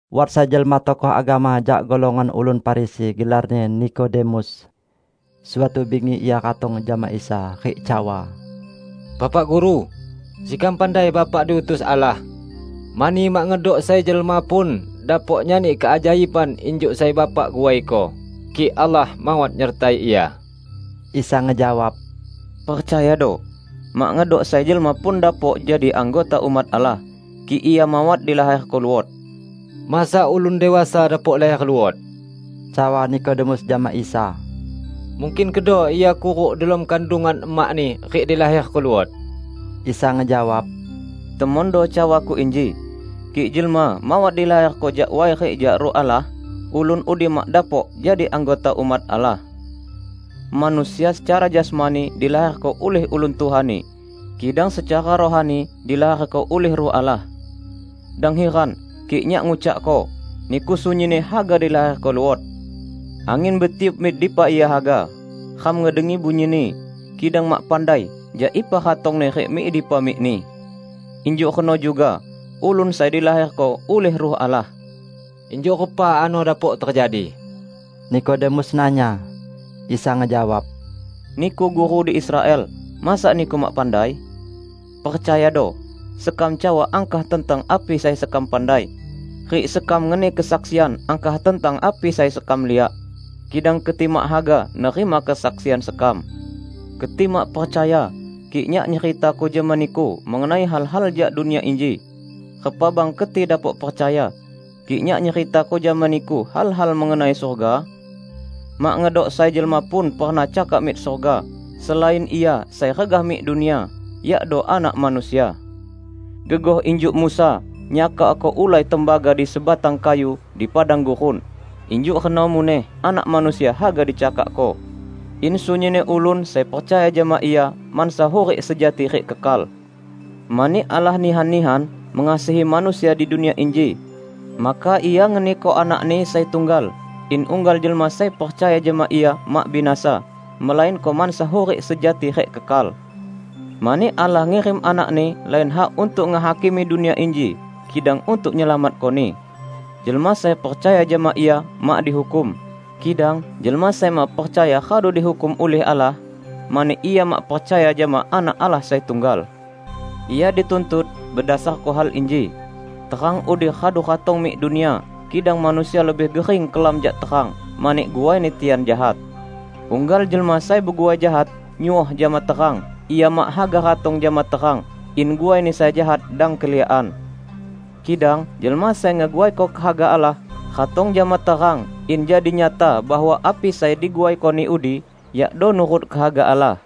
Wat sai jelma tokoh agama jak golongan ulun Farisi, gelarni Nikodemus. Suatu bingi ia ratong jama Isa rik cawa, "Bapa Guru, sekam pandai Bapak diutus Allah. Mani mak ngedok sai jelma pun dapok nyani keajaiban injuk sai Bapak guaiko, kik Allah mawat nyertai Ia." Isa ngejawab, "Percayado, mak ngedok sai jelma pun dapok jadi anggota umat Allah, kik ia mawat dilaherko luot." "Masa ulun dewasa dapok laher luot?" cawa Nikodemus jama Isa. "Mungkin kedo ia kuruk delom kandungan emakni rik dilaherko luot?" Isa ngejawab, "Temondo cawa-Ku inji: kik jelma mawat dilaherko jak way rik jak Ruh Allah, ulun udi mak dapok jadi anggota umat Allah. Manusia secara jasmani dilaherko ulih ulun tuhani, kidang secara rohani dilaherko ulih Ruh Allah. Dang hiran kik Nyak ngucakko: niku sunyinni haga dilaherko luot. Angin betiup mik dipa ia haga; ram ngedengi bunyini, kidang mak pandai jak ipa ratongni rik mik dipa mikni. Injuk reno juga ulun sai dilaherko ulih Ruh Allah." "Injuk repa ano dapok tejadi?" Nikodemus nanya. Isa ngejawab, "Niku guru di Israel; masa niku mak pandai? Percayado: Sekam cawa angkah tentang api sai sekam pandai, rik sekam ngeni kesaksian angkah tentang api sai sekam liak; kidang keti mak haga nerima kesaksian sekam. Keti mak percaya kik Nyak nyeritako jama niku mengenai hal-hal jak dunia inji; repa bang keti dapok percaya, kik Nyak nyeritako jama niku hal-hal mengenai surga? Mak ngedok sai jelma pun pernah cakak mik surga, selain Ia sai regah mik dunia, yakdo Anak Manusia. Gegoh injuk Musa nyakakko ulai tembaga di sebatang kayu di padang gurun, injuk reno muneh Anak Manusia haga dicakakko, in sunyinni ulun sai percaya jama Ia mansa hurik sejati rik kekal." Mani Allah nihan-nihan mengasihi manusia di dunia inji, maka Ia ngeniko Anak-Ni sai tunggal, in unggal jelma sai percaya jama Ia mak binasa, melainko mansa hurik sejati rik kekal. Mani Allah ngirim Anak-Ni lain hak untuk ngehakimi dunia inji, kidang untuk nyelamatkoni. Jelma sai percaya jama Ia mak dihukum. Kidang jelma sai mak percaya radu dihukum ulih Allah, mani ia mak percaya jama Anak Allah sai tunggal. Ia dituntut bedasarko hal inji: Terang udi radu ratong mik dunia, kidang manusia lebih gering kelam jak terang, mani guaini tian jahat. Unggal jelma sai beguai jahat, nyuoh jama terang; ia mak haga ratong jama terang, in guaini sai jahat dang keliakan. Kidang jelma sai ngeguaiko kehaga Allah, ratong jama terang in jadi nyata bahwa api sai diguaikoni udi yakdo nurut kehaga Allah.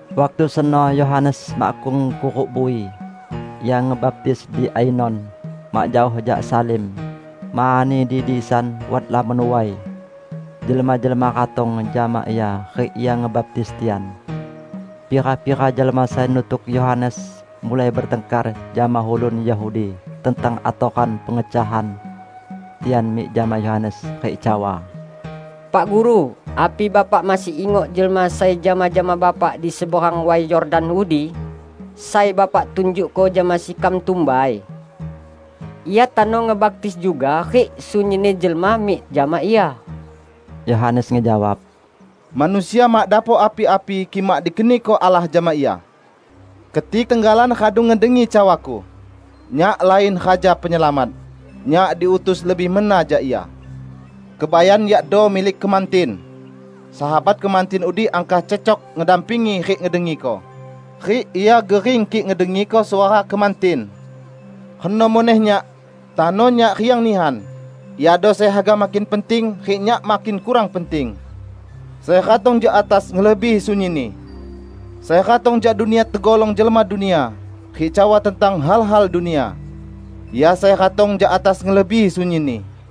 Waktu seno Yohanes makkung kuruk bui. Ia ngebaptis di Ainon, mak jaoh jak Salim, mani di disan wat lamon way. Jelma-jelma ratong jama ia, rik ia ngebaptis tian. Pira-pira jelma sai nutuk Yohanes mulai betangkar jama ulun Yahudi tentang atoran pengecahan. Tian mik jama Yohanes, rik cawa, "Pak Guru, api Bapak masih ingok jelma sai jama-jama Bapak di seberang Way Yordan udi, sai Bapak tunjukko jama sekam tumbai? Ia tano ngebaptis juga, rik sunyinni jelma mik jama Ia." Yohanes ngejawab, "Manusia mak dapok api-api kik mak dikeniko Allah jama ia. Keti tenggalan radu ngedengi cawaku, 'Nyak lain Raja Penyelamat. Nyak diutus lebih mena jak Ia.' Kebayan yakdo milik kemantin. Sahabat kemantin udi angkah cecok ngedampingi rik ngedengiko, rik ia gering kik ngedengiko suara kemantin. Reno muneh nyak. Tano nyak riang nihan. Iado sai haga makin penting, rik nyak makin kurang penting." Sai ratong jak atas ngelebihi sunyinni. Sai ratong jak dunia tegolong jelma dunia, rik cawa tentang hal-hal dunia. Ia sai ratong jak atas ngelebihi sunyinni.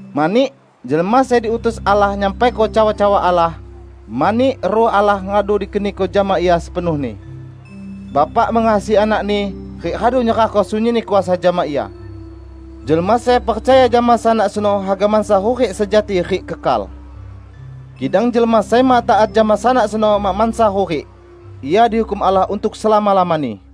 Mani jelma sai diutus Allah nyampaiko cawa-cawa Allah, mani Ruh Allah radu dikeniko jama Ia sepenuhni. Bapa mengasihi Anak-Ni, rik radu nyerahko sunyinni kuasa jama Ia. Jelma sai percaya jama Sanak seno haga mansa hurik sejati rik kekal. Kidang jelma sai mak taat jama Sanak seno mak mansa hurik. Ia dihukum Allah untuk selama-lamani.